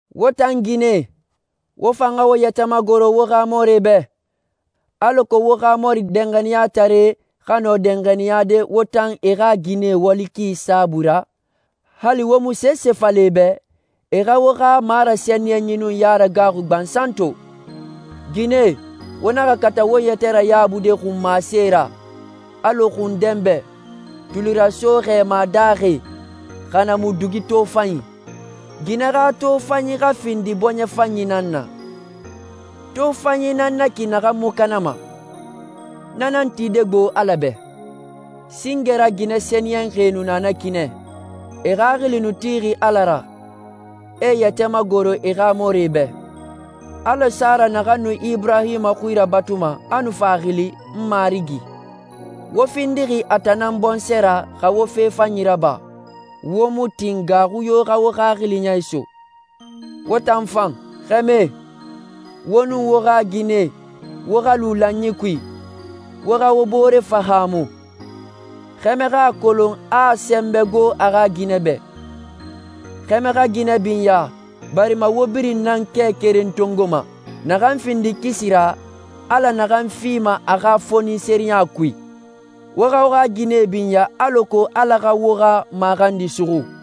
Wo tan ginɛe, wo fan xa wo yɛtɛ magoro wo xa mɔrie bɛ, alako wo xa mɔri danxaniyataree xa nɔ danxaniyade wo tan e xa ginɛe wali ki saabui ra, hali wo mu sese fala e bɛ, e xa wo xa marasɛniyɛnyi nun yaragaaxui gbansan to. Ginɛe, wo naxa kata wo yɛtɛ rayabude xunmasee ra, alɔ xun dɛnbɛ, tulirasoe xɛɛma daaxi, xa na mu dugi tofanyie. Ginɛe xa tofanyi xa findi bɔɲɛ fanyi nan na. Tofanyi nan na ki naxan mu kanama. Na nan tide gbo Ala bɛ. Singe ra ginɛ sɛniyɛnxie nu na ki nɛ. E xaxili nu tixi Ala ra, e e yɛtɛ magoroxi e xa mɔrie bɛ, alɔ Sara naxan nu Iburahima xui rabatuma, a nu fa a xili «n marigi». Wo findixi a tan nan bɔnsɔɛ ra, xa wo fe fanyi raba, wo mu tin gaaxui yo xa wo xaxili ya iso. Wo tan fan, xɛmɛe, wo nun wo xa ginɛe, wo xa lu lanyi kui. Wo xa wo bore fahaamu. Xɛmɛ xa a kolon a a sɛnbɛ gbo a xa ginɛ bɛ. Xɛmɛe xa ginɛe binya barima wo birin nan kɛ keren tongoma, naxan findi kisi ra, Ala naxan fima a xa fonisireya kui. Wo xa wo xa ginɛe binya, alako Ala xa wo xa maxandi suxu.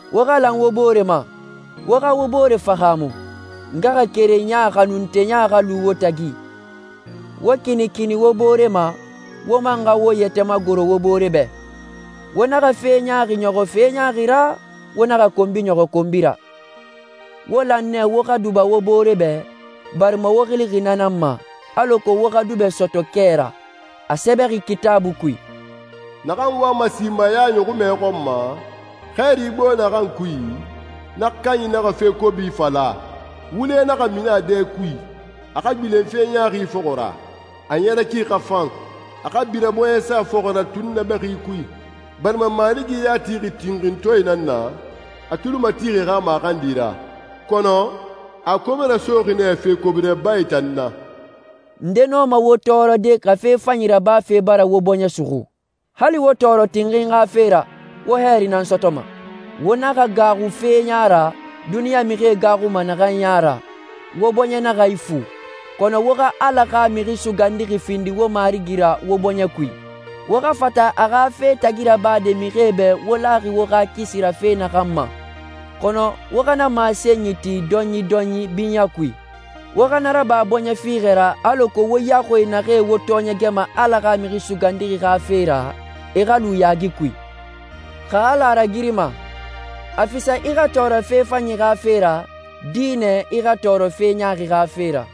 Wo xa lan wo bore ma, wo xa wo bore fahaamu. Ngaxakerenya xanunteya xa lu wo tagi. Wo kinikini wo bore ma, wo man xa wo yɛtɛ magoro wo bore bɛ. Wo naxa fe ɲaaxi ɲɔxɔ fe ɲaaxi ra, wo naxa konbi ɲɔxɔ konbi ra. Wo lan nɛ wo xa duba wo bore bɛ, barima wo xilixi na nan ma, alako wo xa dubɛ sɔtɔ kɛ ra. A sɛbɛxi Kitaabui kui, «Naxan wama simaya ɲɔxunmɛ xɔn ma, hɛɛri gbo naxan kui, na kanyi naxa fe kobi fala, wule naxa mini a dɛ kui. A xa gbilen fe ɲaaxi fɔxɔ ra. A ɲɛrɛ ki xa fan. A xa bira bɔɲɛsa fɔxɔ ra tunnabɛxi kui, barima Marigi ya tixi tinxintɔɛe nan na, a tuli matixi e xa maxandi ra. Kɔnɔ, a a kobe rasoxi nɛ fe kobi rabae tan na.» Nde nɔma wo tɔɔrɔde xa fe fanyi rabafe bara wo bɔɲɛ suxu? Hali wo tɔɔrɔ tinxinyi xa fe ra, wo hɛɛri nan sɔtɔma. Wo naxa gaaxu fe ya ra duniɲa mixie gaaxuma naxan ya ra, wo bɔɲɛ naxa ifu. Kɔnɔ wo xa Ala xa Mixi Sugandixi findi wo Marigi ra wo bɔɲɛ kui. Wo xa fata a xa fe tagi rabade mixie bɛ wo laxi wo xa kisi ra fe naxan ma, kɔnɔ wo xa na masenyi ti dɔyindɔyin binyɛ kui. Wo xa na raba bɔɲɛ fiixɛ ra alako wo yaxui naxee wo tɔɔɲɛgɛma Ala xa Mixi Sugandixi xa fe ra, e xa lu yaagi kui. Xa Ala a ragirima, a fisa i xa tɔɔrɔ fe fanyi xa fe ra, dinɛ i xa tɔɔrɔ fe ɲaaxi xa fe ra.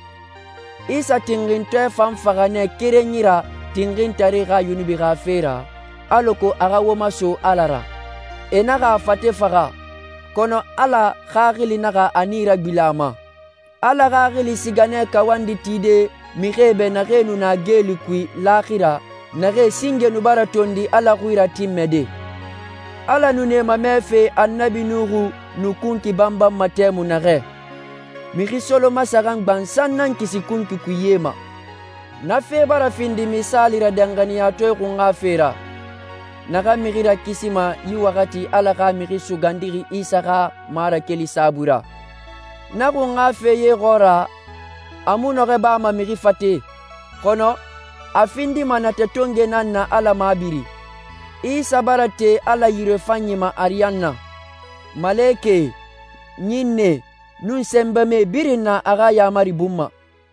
Isa tinxintɔɛ fan faxa nɛ kerenyi ra tinxintaree xa yunubie xa fe ra, alako a xa wo maso Ala ra. E naxa a fate faxa, kɔnɔ Ala Xaxili naxa a nii ragbilen a ma. Ala Xaxili siga nɛ kawandi tide mixie bɛ naxee nu na geeli kui laaxira, naxee singe nu bara tondi Ala xui ratinmɛde. Ala nu na e mamɛfe Annabi Nuha nu kunkui banbanma tɛmui naxɛ. Mixi solomasaxan gbansan nan kisi kunkui kui ye ma. Na fe bara findi misaali ra danxaniyatɔɛ xunxa fe ra, naxan mixi rakisima yi waxati Ala xa Mixi Sugandixi Isa xa marakeli saabui ra. Na xunxafe ye xɔɔra, a mu nɔxɔɛ bama mixi fate, kɔnɔ a findima natɛ tongoe nan na Ala mabiri. Isa bara te Ala yirefanyi ma ariyanna. Malekɛe, ɲinnɛe, nun sɛnbɛmae birin na a xa yaamari bun ma.